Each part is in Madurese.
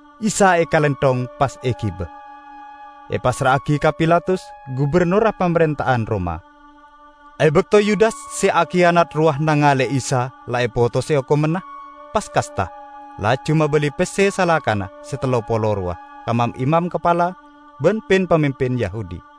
Isa ekalenthong, pas egiba, epassra'agi ka Pilatus, gubennorra pamarenta'an Roma. E bakto Yudas se akiyanat rowa nangale'e Isa la epotose okomanna, pas kasta, laju mabali pesse salakana se tello polo rowa ka mam-imam kapala ban pin-pamimpin Yahudi.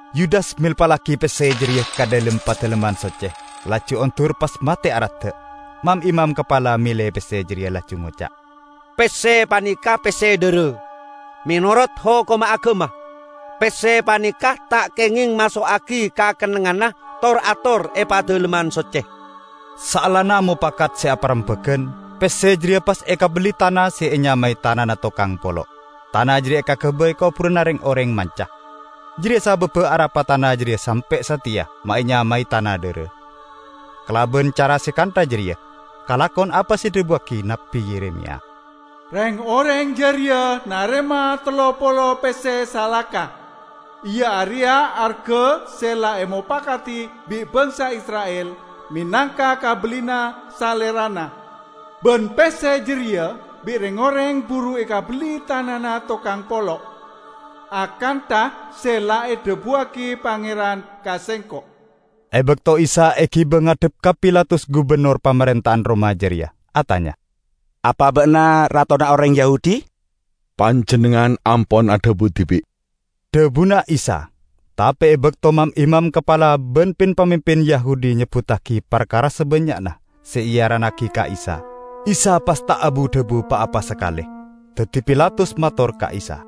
Yudas melpallagi pesse jareya ka dhalem Padalemman Socce, laju ondur pas mate aradda'. Mam-imam kapala mele pesse jareya laju ngoca', "Pesse paneka pesse dhara. Menorot hokomma agama, pesse paneka ta' kengeng maso'agi ka kennengnganna tor-ator e Padalemman Socce." Saellana mopakat se aparembagan, pesse jareya pas ekabelli tana se enyamae Tanana Tokang Polo'. Tana jareya ekagabay koburanna reng-oreng manca. Jareya sababba arapa tana jareya sampe' sateya ma' enyamae "Tana Dhara." Kalaban cara se kantha jareya kalakon apa se edhabuwagi Nabbi Yeremiya, "Reng-oreng jareya narema tello polo pesse salaka, iya areya arga se la emopakadi bi' bangsa Isra'il menangka kabellina Salerana. Ban pesse jareya bi' reng-oreng buru ekabelli tanana tokang polo', akantha se la edhabuwagi Pangeran ka sengko'." E bakto Isa egiba ngadhep ka Pilatus gubennor pamarenta'an Roma jareya, atanya, "Apa ba'na ratona oreng Yahudi?" "Panjennengngan ampon adhabu dibi'," dhabuna Isa. Tape e bakto mam-imam kapala ban pin-pamimpin Yahudi nyebbuttagi parkara sabannya'na se earannagi ka Isa, Isa pas ta' abu-dhabu pa-apa sakale. Daddi Pilatus mator ka Isa,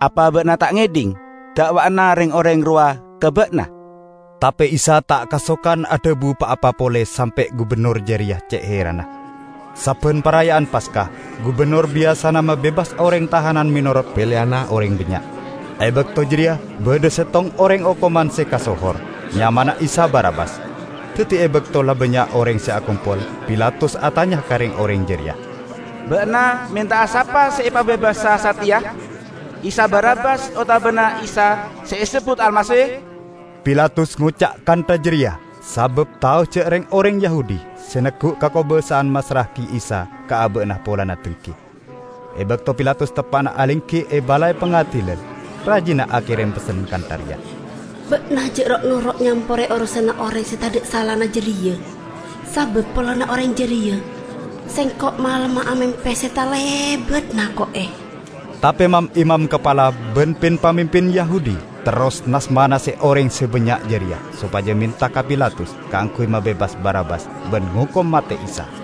"Apa ba'na ta' ngedhing da'wa'anna reng-oreng rowa ka ba'na?" Tape Isa ta' kasokan adhabu pa-apa pole sampe' gubennor jareya ce' heranna. Sabban Paraya'an Paska, gubennor biyasana mabebas oreng tahanan menorot peleyanna oreng bannya'. E bakto jareya badha settong oreng okoman se kasohor. Nyamana Isa Barabbas. Daddi e bakto la bannya' oreng se akompol, Pilatus atanya ka reng-oreng jareya, "Ba'na menta'a sapa se epabebasa sateya, Isa Barabbas otabana Isa se esebbut Almasih?" Pilatus ngoca' kantha jareya sabab tao ja' reng-oreng Yahudi se neggu' kakobasa'an massra'agi Isa ka aba'na polana denggi. E bakto Pilatus teppa'na alenggi e balai pangadilan, rajina akerem pessen kantha reya, "Ba'na ja' ro'-noro' nyampore orosanna oreng se tadha' salana jareya, sabab polana oreng jareya, sengko' malemma amempe se talebat nako'e." Tape mam-imam kapala ban pin-pamimpin Yahudi terros nas-manase oreng se bannya' jareya sopaja menta ka Pilatus kaangguy mabebas Barabbas ban ngokom mate Isa.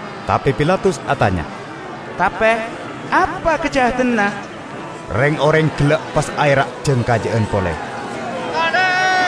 Tape Pilatus atanya, "Tape apa kajahadanna?" Reng-oreng gella' pas aera' jang kaja'an pole, "Salib!"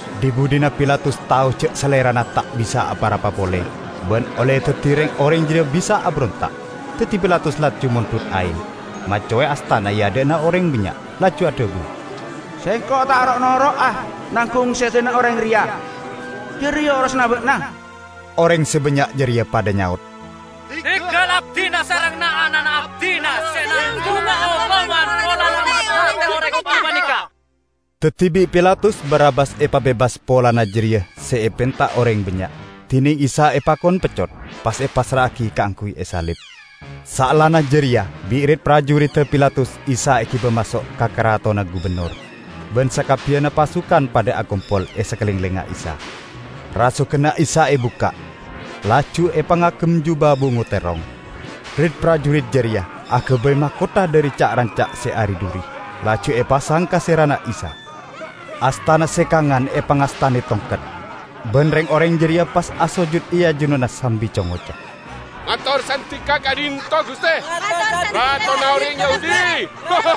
Dhi-budhina Pilatus tao ja' salerana ta' bisa apa-rapa pole, ban olle daddi reng-oreng jareya bisa aberonta'. Daddi Pilatus laju mondhut aeng, maccowe astana e adha'na oreng bannya' laju adhabu, "Sengko' ta' ro'-noro'a nanggung sedana oreng reya! Jareya orosanna ba'na!" Oreng se bannya' jareya padha nyaot, "Dinggal abdina sareng na'-ana' abdina se nanggunga okoman polana mate'e oreng gapaneka!" Daddi bi' Pilatus Barabbas epabebas polana jareya se epenta oreng bannya', dineng Isa epakon peccot, pas epassra'agi kaangguy esalib. Saellana jareya bi' rit-parjuridda Pilatus Isa egiba maso' ka karatonna gubennor, ban sakabbiyanna pasukan padha akompol e sakalenglengnga Isa. Rasoganna Isa ebukka', laju epangagem juba bungo terrong. Rit-parjurit jareya agabay makotha dhari ca'-ranca' se ari-dhuri, laju epasang ka serana Isa. Astana se kangan epangastane tongket, ban reng-oreng jareya pas asojud e ajunanna sambi co-ngoco, "Mator sandika ka'dhinto' Guste, Ratona Oreng Yahudi!"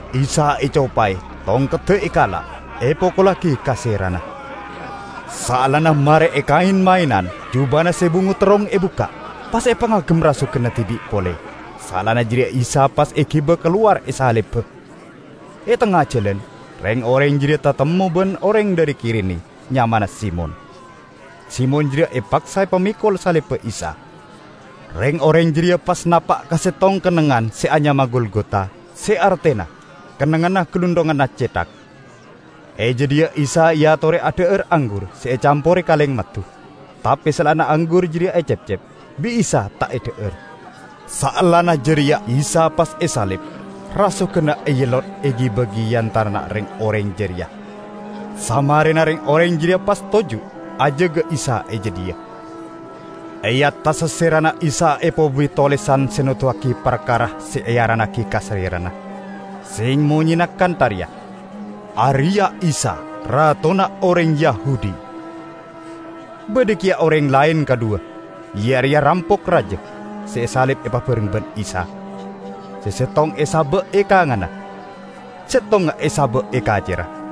Isa ecopae, tongkedda ekala', epokollagi ka serana. Saellana mare ekaen-maenan, jubana se bungo terrong ebukka', pas epangagem rasoganna dibi' pole. Saellana jareya Isa pas egiba kalowar esaliba. E tengnga jalan, reng-oreng jareya tatemmo ban oreng dhari Kirene nyamana Simon. Simon jareya epaksa epamekol salibba Isa. Reng-oreng jareya pas napa' ka settong kennengngan se anyama Golgota, se artena "Kennengnganna Galunthonganna Cethak". E jadhiya Isa eatore adha'ar anggur se ecampore kalengmaddu. Tape saellana anggur jareya ecepcep, bi' Isa ta' edha'ar. Saellana jareya Isa pas esalib; rasoganna eellot egi-bagi e antarana reng-oreng jareya. Samarena, reng-oreng jareya pas toju' ajaga Isa e jadhiya. E attassa serana Isa epobuwi tolesan se noduwagi parkara se earannagi ka salerana, se monyena kantha reya: "Areya' Isa, Ratona Oreng Yahudi". Badha keya oreng laen kadhuwa, iya areya rampok raja, se esalib epabareng ban Isa; se settong esaba' e kanganna, settongnga esaba' e kacerra.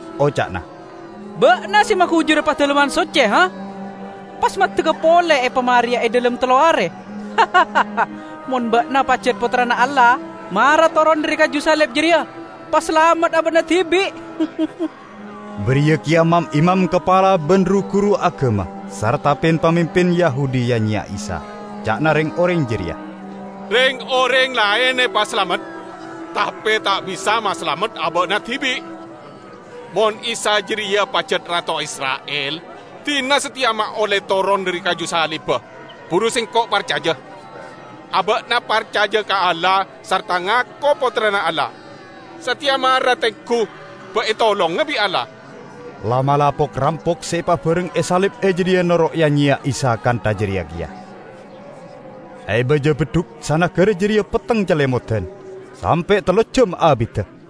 Oca'na, "Ba'na se magujura Padalemman Socce, pas maddegga pole epamareya e dhalem tello are! Mon ba'na pajat Pottrana Allah, mara toron dhari kaju salib jareya, pasalamet aba'na dibi'!" Bariya keya mam-imam kapala ban ru-guru agama sarta pin-pamimpin Yahudi ya-nyeya Isa. Ca'na reng-oreng jareya, "Reng-oreng laen epasalamet, tape ta' bisa masalamet aba'na dibi'! Mon Isa jareya pajat rato Isra'il, dina sateya ma' olle toron dhari kaju salibba, buru sengko' parcaja. Aba'na parcaja ka Allah, sarta ngako Pottrana Allah. Sateya mara tenggu ba' etolonga bi' Allah." La'-mala' pok-rampok se epabareng esalib e jadhiya noro' ya-nyeya Isa kantha jareya keya. E baja beddhuk sanagara jareya petteng calemodan, sampe' tello ejjam abidda.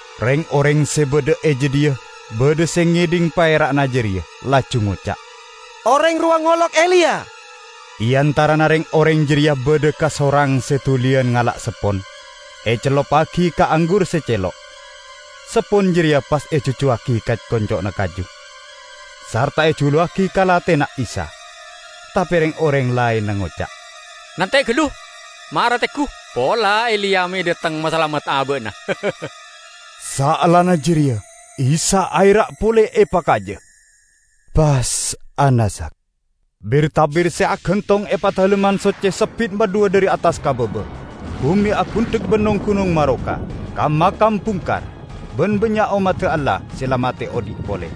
Reng-oreng se badha e jadhiya badha se ngedhing paera'na jareya, laju ngoca', "Oreng rowa ngolok Eliya!" E antarana reng-oreng jareya badha kasorang se duliyan ngala' seppon, ecelluppagi ka anggur se celo'. Seppon jareya pas ejujjuwagi ka konco'na kaju, sarta ejuluwagi ka lathena Isa. Tape reng-oreng laenna ngoca', "Nante' gallu, mara tenggu pola Eliya me' dhateng masalamet aba'na!" Saellana jareya Isa aera' pole epakaja, pas anaza'. Bir-tabir se agantong e Padalemman Socce sebbit madhuwa dhari attas ka baba. Bume agundhek ban nong-gunong maroka. Kam-makam bungkar, ban bannya' ommadda Allah se la mate odhi' pole.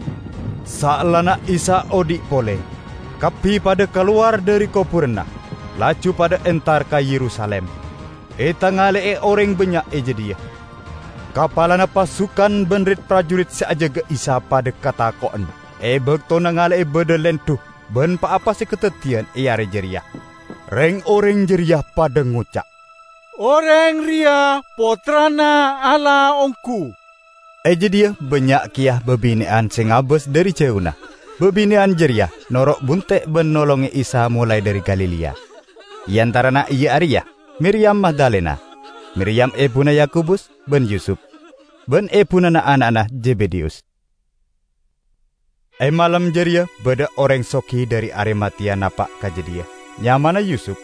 Saellana Isa odhi' pole kabbi padha kalowar dhari koburanna, laju padha entar ka Yerusalim, etangale'e oreng bannya' e jadhiya. Kapalana pasukan ban rit-parjurit se ajaga Isa padha katako'en e bakto nangale'e badha lendhu ban pa-apa se kadaddiyan e are jareya. Reng-oreng jareya padha ngoca', "Oreng reya Pottrana Allah onggu!" E jadhiya bannya' keya babine'an se ngabas dhari jauna. Babine'an jareya noro' bunte' ban nolonge Isa molae dhari Galilea. E antarana iya areya Miriyam Magdalena, Miriyam ebuna Yakobus ban Yusup, ban ebuna na'-ana'na Zebedeyus. E malem jareya badha oreng sogi dhari Arimateya napa' ka jadhiya; nyamana Yusup,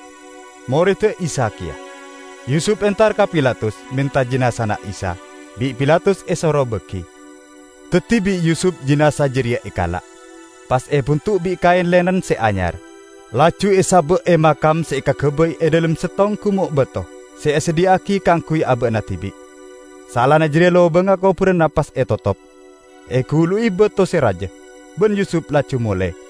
moredda Isa keya. Yusup entar ka Pilatus, menta jinazana Isa. Bi' Pilatus esoro bagi. Daddi bi' Yusup jinaza jareya ekala', pas ebundu' bi' kaen linen se anyar, laju esaba' e makam se ekagabay e dhalem settong gumo' bato se esadhiya'agi kaangguy aba'na dibi'. Saellana jareya lobangnga koburanna pas etotop, egulu'i bato se raja, ban Yusup laju mole.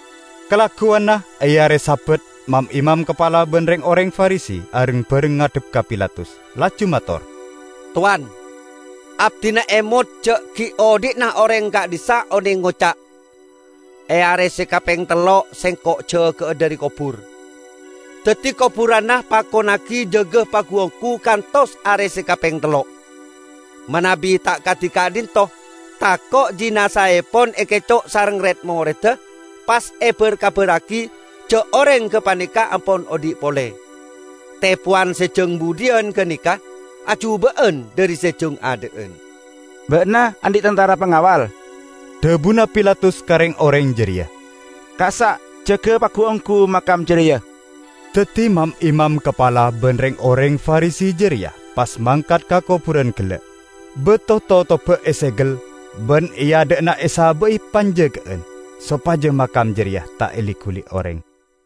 Kalagguwanna, e are Sabat, mam-imam kapala ban reng-oreng Farisi areng-bareng ngadhep ka Pilatus laju mator, "Towan, abdina emot ja' gi' odhi'na oreng ka'dhissa' oneng ngoca', 'E are se kapeng tello' Sengko' jaga'a dhari kobur.' Daddi, koburanna pakonnagi jaga pagu-onggu kantos are se kapeng tello', manabi ta' kadi ka'dhinto' tako' jinazaepon ekeco' sareng red-moredda pas ebar-kabarragi ja' oreng gapaneka ampon odhi' pole. Tepowan se jang budhiyan gapaneka ajuba'an dhari se jang adha'an." "Ba'na andhi' tantara pangawal," dhabuna Pilatus ka reng-oreng jareya, "kassa' jaga pagu-onggu makam jareya." Daddi mam-imam kapala ban reng-oreng Farisi jareya pas mangkat ka koburan gella', bato totobba esegel ban e adha'na esaba'i panjaga'an, sopaja makam jareya ta' eli-guli oreng.